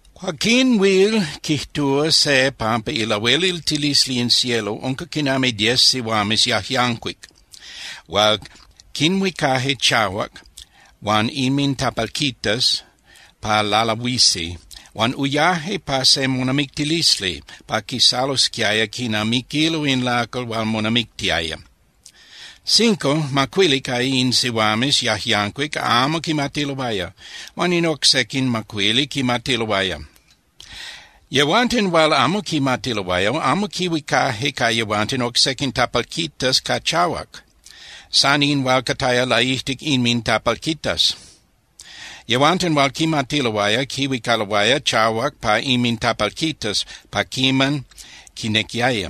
’Cuaquín huil quijtúa se pampa ilahueliltilisli in cielo unca quinami diez sihuames yajyancuic hual quinhuicaje chahuac huan inmintapalquitas pa lalahuisi huan uyaje pa se monamictilisli pa quisalosquiaya quinamiquilo in lacal hual monamictiaya. Cinco (macuili) ca in sihuames yajyancuic amo quimatiloaya huan in oc sequin macuili quimatiloaya. Yehuanten hual amo quimatiloaya amo quihuicaje ca yehuanten oc sequin tapalquitas ca chahuac, san in hual cataya laijtic inmintapalquitas. Yehuanten hual quimatiloaya quihuicaloaya chahuac pa inmintapalquitas pa quiman quinequiaya.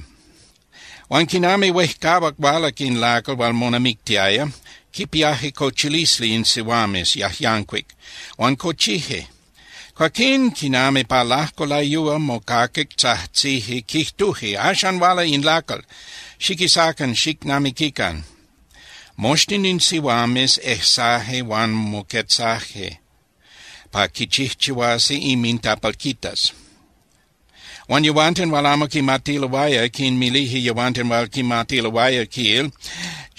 Huan quinami huejcahuac hualac in lacal hual monamictiaya, quipiaje cochilisli in sihuames yajyancuic huan cochije. Cuaquín quinami pa lajco layúa mocaquic tzajtzije, quijtuje: “¡Axan huala in lacal! ¡Xiquisacan xicnamiquican!” Moxtin in sihuames ejsaje huan moquetzaje pa quichijchihuasi inmintapalquitas. Huan yehuanten hual amo quimatiloaya quinmilije yehuanten hual quimatiloaya, quil: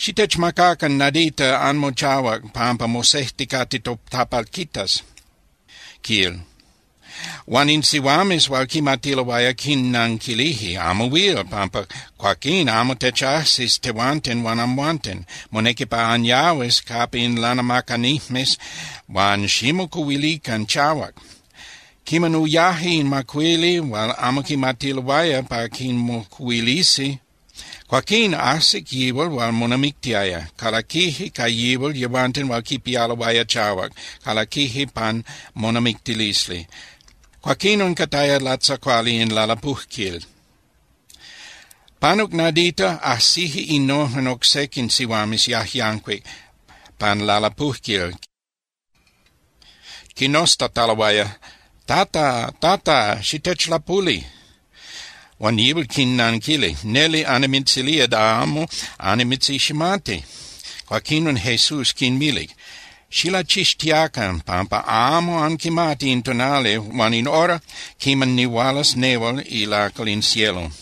“Xitechmacacan nadita anmochahuac pampa mosejticate totapalquitas”, quil. Huan in sihuames hual quimatiloaya quinnanquilije: “Amo huil, pampa cuaquín amo techajsis tehuanten huan amhuanten. Monequi pa anyahuis capa in lanamacanijmes huan ximocuhuilican chahuac.” Quiman uyaje in macuili hual amo quimatiloaya pa quimocuhuilisi, cuaquín ajsic yihual hual monamictiaya. Calaquije ca yihual yehuanten hual quipialoaya chahuac, calaquije pan monamictilisli, cuaquinon cataya latzacuali in lalapujquil. Panuc nadita, ajsije innojen oc sequin sihuames yajyancuic pan lalapujquil quinoztataloaya: “¡Tata, Tata, xitechlapuli!” Huan yihual quinnanquilic: “Neli, annimitzilía da amo annimitziximati.” Cuaquinon Jesús quinmilic: —Xilachixtiacan, pampa amo anquimati in tonali huan in hora quiman nihualas nehual ilacal in cielo.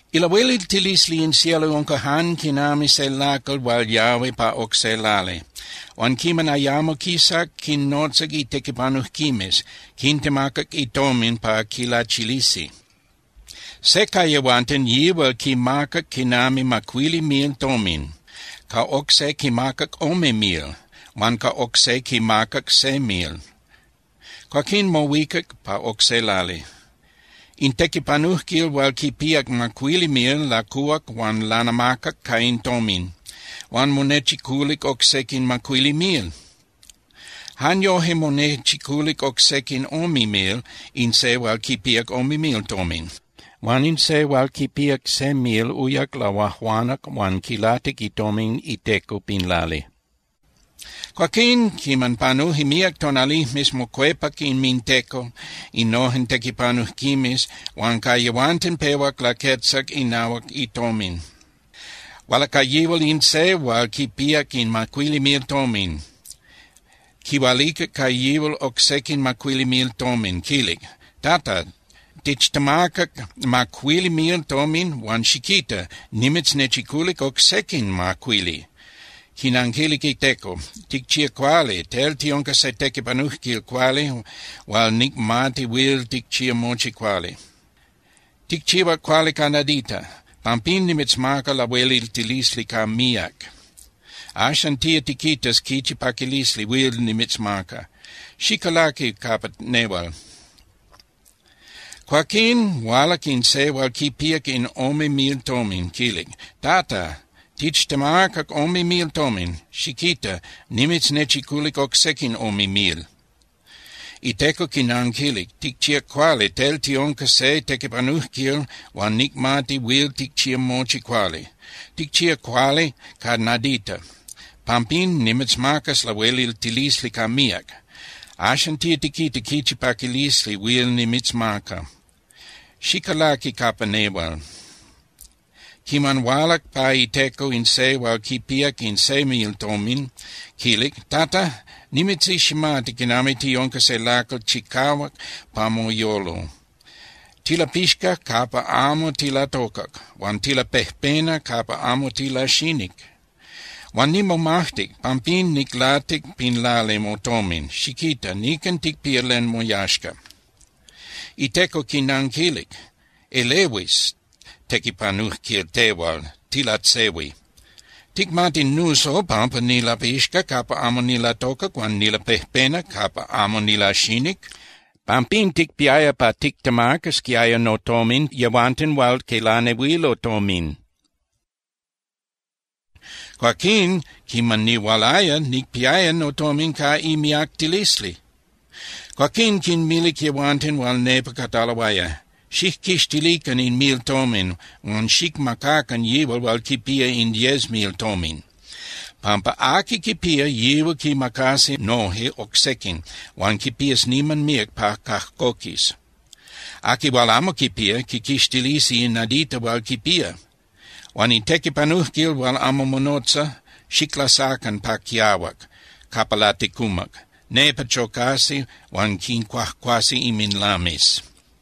’Ilahueliltilisli in cielo unca jan quinami se lacal hual yahui pa oc se lali, huan quiman ayamo quisac, quinnotza itequipanujquimes, quintemacac itomin pa quilachilisi. ’Se ca yehuanten yihual quimacac quinami macuili mil tomin, ca oc se quimacac ome mil, huan ca oc se quimacac se mil. Cuaquín mohuicac pa oc se lali. In tequipanujquil hual quipíac macuili mil lacuhuac huan lanamacac ca in tomin, huan monechiculic oc sequin macuili mil. Jan yoje monechiculic oc sequin ome mil in se hual quipíac ome mil tomin. Huan in se hual quipíac se mil uyac lahuajuanac huan quilatic itomin iteco pin lali. ’Cuaquín, quiman panuje míac tonalijmes, mocuepac inminteco innojen tequipanujquimes huan ca yehuanten pehuac laquetzac inahuac itomin. Hualac ca yihual in se hual quipíac in macuili mil tomin, quihualicac ca yihual oc sequin macuili mil tomin, quilic: “Tata, tichtemacac macuili mil tomin huan xiquita, nimitznechiculic oc sequin macuili.” Quinanquilic iteco: “Ticchíac cuali, tel tiunca se tequipanujquil cuali hual nicmati huil ticchía mochi cuali. Ticchihuac cuali ca nadita. Pampín nimitzmacas lahueliltilisli ca míac. Axan tía tiquitas quichi paquilisli huil nimitzmaca. Xicalaqui capa nehual.” Cuaquín hualac in se hual quipíac in ome mil tomin, quilic: “Tata, tichtemacac ome mil tomin. Xiquita, nimitznechiculic oc sequin ome mil.” Iteco quinanquilic: “Ticchíac cuali, tel tiunca se tequipanujquil hual nicmati huil ticchía mochi cuali. Ticchíac cuali ca nadita. Pampín nimitzmacas lahueliltilisli ca míac. Axan tía tiquita quichi paquilisli huil nimitzmaca. Xicalaqui capa nehual.” Quiman hualac pa iteco in se hual quipíac in se mil tomin, quilic: “Tata, nimitziximati quinami tiunca se lacal chicahuac pa moyolo. Tilapixca capa amo tilatocac huan tilapejpena capa amo tilaxinic. Huan nimomajtic, pampín niclatic pin lali motomin. Xiquita, nican ticpía len moyaxca.” Iteco quinanquilic: “Elehuis tequipanujquil tehual, tilatzehui. ¿Ticmati nuso pampa nilapixca capa amo nilatocac huan nilapejpena capa amo nilaxinic? Pampín ticpiaya pa tictemacasquiaya notomin yehuanten hual quilanehuilo tomin. Cuaquín quiman nihualaya, nicpiaya notomin ca imiactilisli.” Cuaquín quinmilic yehuanten hual nepa cataloaya: “Xijquixtilican in mil tomin huan xicmacacan yihual hual quipía in diez mil tomin.” Pampa aqui quipía, yihual quimacasi noje oc sequin huan quipías niman míac pa cajcoquis. Aqui hual amo quipía, quiquixtilisi in nadita hual quipía. Huan in tequipanujquil hual amo monotza, xiclasacan pa quiahuac capa laticumac. Nepa chocasi huan quincuajcuasi inminlames.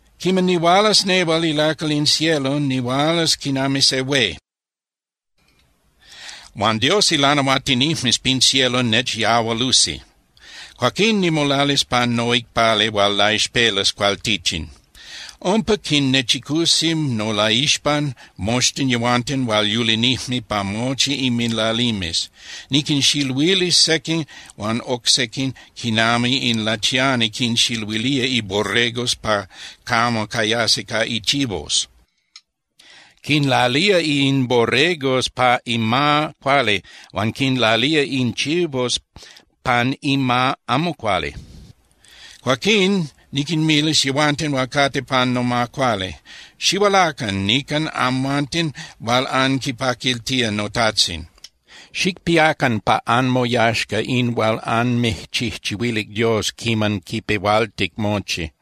’Quiman nihualas nehual ilacal in cielo, nihualas quinami se hué, huan Dios ilanahuatinijmes pin cielo nechyahualusi. Cuaquín nimolalis pan noicpali hual laixpelas cualtichin. Umpa quinnechicusi nolaixpan moxtin yehuanten hual yulinijme pa mochi inminlalimes. Niquinxiluilis sequin huan oc sequin quinami in lachiani quinxiluilía iborregos pa camo cayasi ca ichivos. Quinlalía in borregos pa ima cuali huan quinlalía in chivos pan ima amo cuali. Cuaquín niquinmilis yehuanten hual cate pan noma cuali: “Xihualacan nican amhuanten hual anquipaquiltía noTajtzin, xicpiacan pa anmoyaxca in hual anmijchijchihuilic Dios quiman quipehualtic mochi.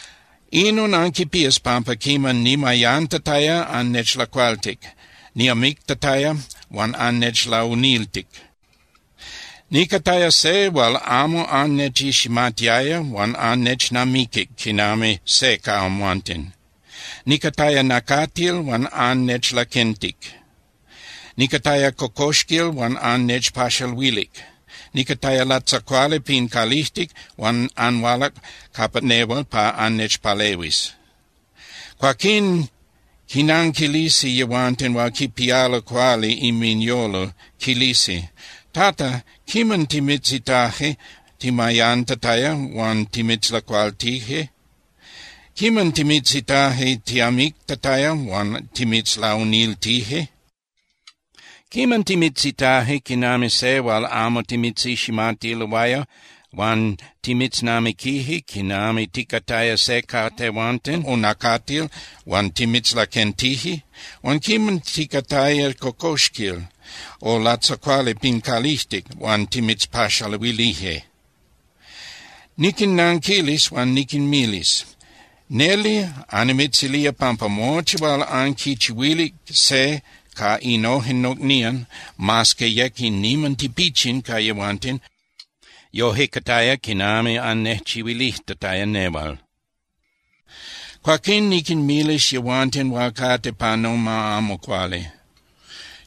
Inon anquipías pampa quiman nimayantataya, annechlacualtic, niamictataya huan annechlauniltic, nicataya se hual amo annechiximatiaya huan annechnamiquic quinami se ca amhuanten. Nicataya nacatil huan annechlaquentic, nicataya cocoxquil huan annechpaxaluilic, nicataya latzacuali pin calijtic, huan anhualac capa nehual pa annechpalehuis.” Cuaquín quinanquilisi yehuanten hual quipialo cuali inminyolo, quilisi: “Tata, ¿quiman timitzitaje timayantataya huan timitzlacualtije? ¿Quiman timitzitaje tiamictataya huan timitzlauniltije? ¿Quiman timitzitaje quinami se hual amo timitziximatiloaya huan timitznamiquije quinami ticataya se ca tehuanten, o nacatil huan timitzlaquentije? Huan ¿quiman ticataya cocoxquil, o latzacuali pin calijtic huan timitzpaxaluilije?” ’Niquinnanquilis huan niquinmilis: “Neli annimitzilía pampa mochi hual anquichihuilic se ca innojen nocnían, mas que yec in niman tipichin ca yehuanten, yoje cataya quinami annejchihuilijtataya nehual.” ’Cuaquín niquinmilis yehuanten hual cate pa noma amo cuali: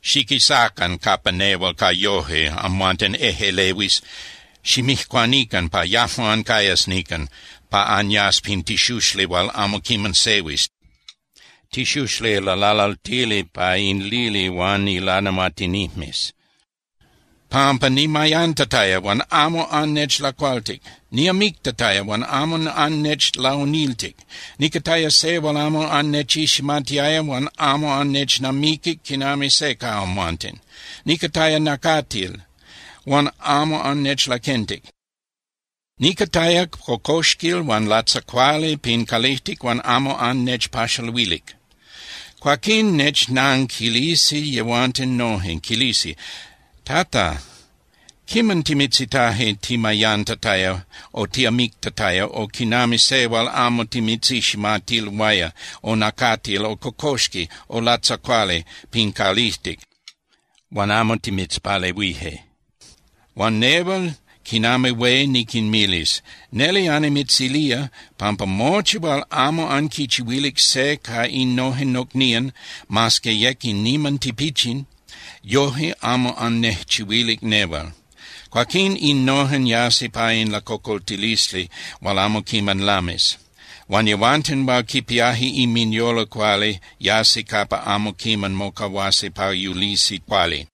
“Xiquisacan capa nehual ca yoje, amhuanten ejꞌelehuis, ximijcuanican pa yajmo ancayas nican, pa anyas pin tixuxli hual amo quiman sehuis, tixuxli lalalaltili pa in lili huan ilanahuatinijmes. Pampa nimayantataya huan amo annechlacualtic, niamictataya huan amo annechlauniltic. Nicataya se hual amo annechiximatiaya huan amo annechnamiquic quinami se ca amhuanten. Nicataya nacatil, huan amo annechlaquentic. Nicataya cocoxquil huan latzacuali pin calijtic huan amo annechpaxaluilic.” Cuaquín nechnanquilisi yehuanten noje, quilisi: “Tata, ¿quiman timitzitaje timayantataya o tiamictataya o quinami se hual amo timitziximatiloaya o nacatil o cocoxqui o latzacuali pin calijtic huan amo timitzpalehuije?” Huan nehual quinami hué niquinmilis: “Neli annimitzilía pampa mochi hual amo anquichihuilic se ca innojen nocnían, mas que yec in niman tipichin, yoje amo annejchihuilic nehual.” Cuaquín innojen yasi pa in lacocoltilisli hual amo quiman lamis, huan yehuanten hual quipiaje inminyolo cuali yasi capa amo quiman mocahuasi pa yulisi cuali.